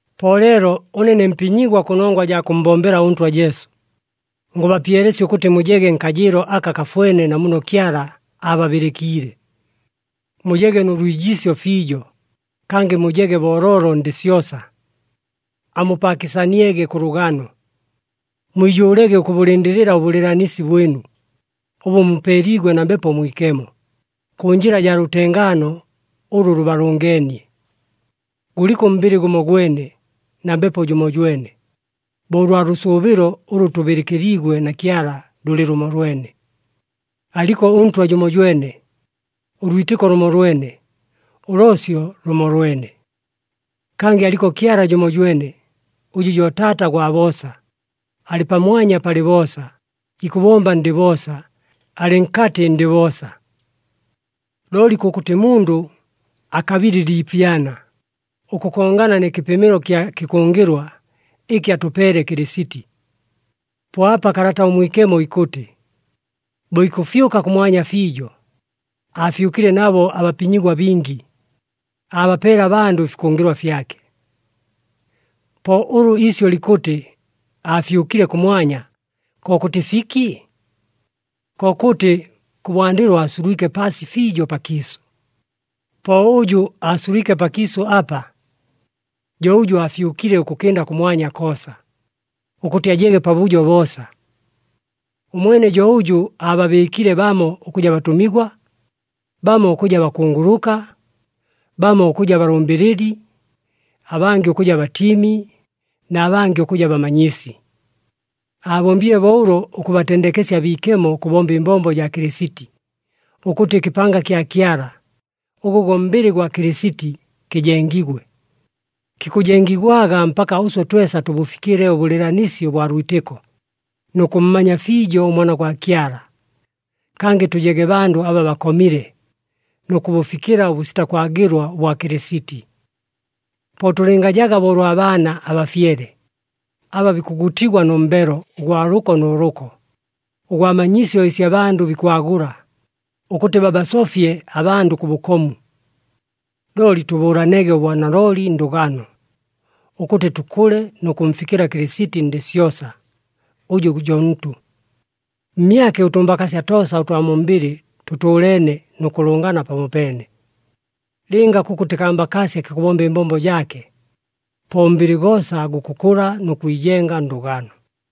Po leelo ʉne ne mpinyigwa kʉnongwa jaa kʉmmbombela ʉNtwa Jesu, ngʉbapyelesya ʉkʉtɨ mujege nkajɨɨlo aka kafwene na muno Kyala aababɨlɨkiile. Mujege nʉ lwijiisyo fiijo, kangɨ mujege booloolo ndɨ syosa. Amupaakɨsaniege kʉ lʉgano. Mwijʉʉlege ʉkʉbʉlɨndɨlɨla ʉbʉlɨɨlanisi bwɨnu, ʉbʉ mupeeliigwe na Mbepo Mwikemo, kʉ njɨla jaa lʉtengaano ʉlʉ lʉbalʉngeenie. Gʉliko ʉmbɨlɨ gʉmogwene, na Mbepo jʉmojwene, bo ʉlwa lʉsʉʉbɨlo ʉlʉ tʉbɨlɨkɨliigwe na Kyala lʉlɨ lʉmolwene. Aliko ʉNtwa jʉmojwene, ʉlwitɨko lʉmolwene, ʉloosyo lʉmolwene. Kangɨ aliko Kyala jʉmojwene, ʉjʉ jo Taata gwa boosa, alɨ pamwanya palɨ boosa, ikʉbomba ndɨ boosa, alɨ nkatɨ ndɨ boosa. Looli kʉkʉtɨ mundʉ akabile ɨliipyana, ʉkʉkongana nɨ kɨpɨmɨlo kya kɨkʉngɨlwa, ɨkɨ atʉpeele Kɨlɨsiti. Po apa Kalata ʉMwikemo ikʉtɨ, “Bo ikʉfyʉka kʉmwanya fiijo, aafyʉkile nabo abapinyigwa bingi, aabapeele abandʉ ɨfikʉngɨlwa fyake.” Po ʉlʉ iisyʉ likʉtɨ, “Aafyʉkile kʉmwanya,” kokʉtɨ fiki? Kokʉtɨ, kʉbwandɨlo aasulwike paasi fiijo pakiisʉ. Po ʉjʉ aasulwike pakiisʉ apa, jo ʉjʉ aafyʉkile ʉkʉkɨnda kʉmwanya koosa, ʉkʉtɨ ajege pabʉjo boosa. Ʉmwene jo ʉjʉ aababɨɨkile bamo ʉkʉja batʉmigwa, bamo ʉkʉja bakunguluka, bamo ʉkʉja balʉmbɨlɨli, abangɨ ʉkʉja batiimi, na bangɨ ʉkʉja bamanyisi. Aabombile bo ʉlo ʉkʉbatendekesya abiikemo ʉkʉbomba ɨmbombo jaa Kɨlɨsiti, ʉkʉtɨ ɨkɨpanga kya Kyala, ʉgʉ go mbɨlɨ gwa Kɨlɨsiti, kɨjengigwe. Kikʉjengigwaga mpaka ʉswe twesa tʉbʉfikɨle ʉbʉlɨɨlanisi ʉbwa lwitɨko, nʉ kʉmmanya fiijo ʉMwana gwa Kyala, kangɨ tʉjege bandʉ aba bakomile, nʉ kʉbʉfikɨla ʉbʉsita kwagɨlwa ʉbwa Kɨlɨsiti. Po tʉlɨngajaga bo ʉlwa baana abafyele, aba bikʉgutigwa nʉ mbelo ʉgwa lʉko nʉ lʉko, ʉgwa manyisyo ɨsi abandʉ bikwagʉla, ʉkʉtɨ babasofye abandʉ kʉ bʉkomu. Looli tʉbʉʉlanege ʉbwanalooli ndʉgano, ʉkʉtɨ tʉkʉle nʉ kʉmfikɨla Kɨlɨsiti ndɨ syosa, ʉjʉ jo ntʉ. Mmyake, ʉtʉmbakaasya toosa ʉtwa mu mbɨlɨ tʉtʉʉleene nʉ kʉlʉngana pamopeene. Lɨnga kʉkʉtɨ kambakaasya kikʉbomba ɨmbombo jaake, po ʉmbɨlɨ goosa gukʉkʉla nʉ kwijenga ndʉgano.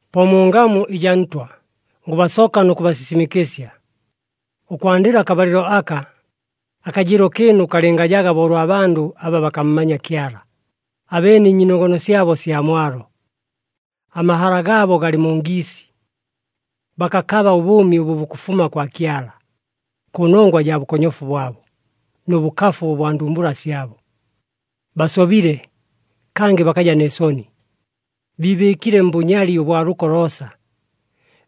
Po mu ngamu ɨjaa Ntwa, ngʉbasoka nʉ kʉbasisimɨkɨsya, ʉkwandɨla akabalɨlo aka, akajɨɨlo kɨɨnu kalɨngajaga bo ʉlwa bandʉ aba bakammanya Kyala, abeene ɨnyiinogono syabo sya mwalo. Amahala gaabo galɨ mu ngiisi. Bakakaba ʉbʉʉmi ʉbʉ bukʉfuma kwa Kyala, kʉnongwa jaa bʉkonyofu bwabo, nʉ bʉkafu ʉbwa ndumbula syabo. Basobile, kangɨ bakaja nɨ soni, biibɨɨkile mbʉnyali ʉbwa lʉko loosa,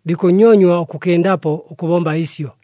bikʉnyonywa ʉkʉkɨndapo ʉkʉbomba ɨsyo.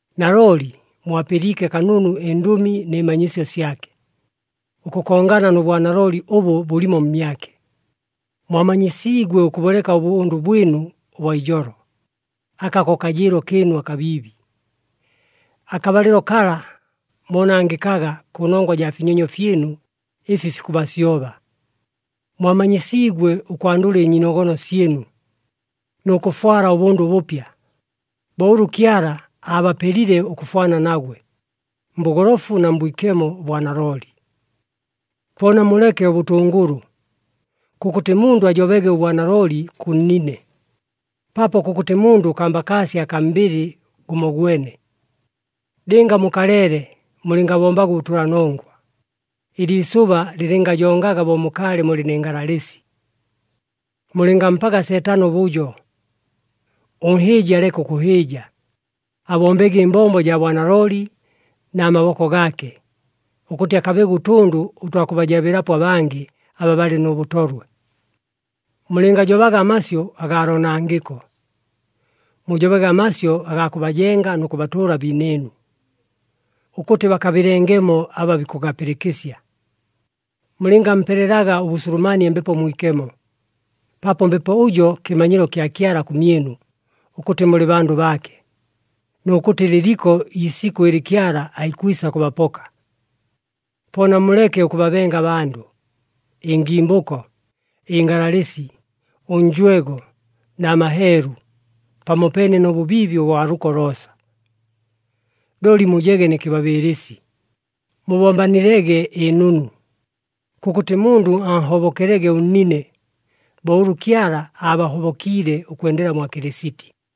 Nalooli mwapɨliike kanunu ɨndʉmi nɨ manyisyo syake, ʉkʉkongana nʉ bwanalooli ʉbʉ bʉlimo mmyake. Mwamanyisiigwe ʉkʉbʉleka ʉbʉndʉ bwɨnu ʉbwa ijolo, aka ko kajɨɨlo kɨɨnu akabiibi. Akabalɨlo kala moonangɨkaga kʉnongwa jaa finyonyo fyɨnu ɨfi fikʉbasyoba. Mwamanyisiigwe ʉkwandʉla ɨnyiinogono syɨnu, nʉ kʉfwala ʉbʉndʉ ʉbʉpya, bo ʉlʉ Kyala aabapelile ʉkʉfwana nagwe, mbʉgolofu na mbwikemo ʉbwa nalooli. Po namuleke ʉbʉtʉngʉlʉ! Kʉkʉtɨ mundʉ ajobege ʉbwanalooli kʉ nnine, paapo kʉkʉtɨ mundʉ kambakaasya akaa mbɨlɨ gʉmogwene. “Lɨnga mukaleele, mulɨngabombaga ʉbʉtʉlanongwa.” Ɨliisʉba lɨlɨngajongaga bo mukaalɨ mulɨ nɨ ngalalɨsi. Mulɨngampaga Seetano ʉbʉjo. Ʉnhɨɨji aleke ʉkʉhɨɨja, abombege ɨmbombo jaa bwanalooli na maboko gaake, ʉkʉtɨ akabege ʉtʉndʉ ʉtwa kʉbajabɨlapo abangɨ aba balɨ nʉ bʉtolwe. Mulɨngajobaga amasyʉ agaa loonangɨko, mujobege amasyʉ agaa kʉbajenga nʉ kʉbatʉʉla abiinɨɨnu, ʉkʉtɨ bakabɨlengemo aba bikʉgapɨlɨkɨsya. Mulɨngampelelaga ʉbʉsulumanie Mbepo Mwikemo, paapo Mbepo ʉjo kɨmanyilo kya Kyala kʉmyɨnu ʉkʉtɨ mulɨ bandʉ baake, nʉ kʉtɨ lɨliko iisikʉ ɨlɨ Kyala aikwisa kʉbapoka. Po namuleke ʉkʉbabenga abandʉ, ɨngimbʉko, ɨngalalɨsi, ʉnjwego na maheelu, pamopeene nʉ bʉbiibi ʉbwa lʉko loosa. Looli mujege nɨ kɨbabɨɨlɨsi, mubombelanilege ɨnunu. Kʉkʉtɨ mundʉ anhobokelege ʉnnine, bo ʉlʉ Kyala aabahobokiile ʉkwendela mwa Kɨlɨsiti.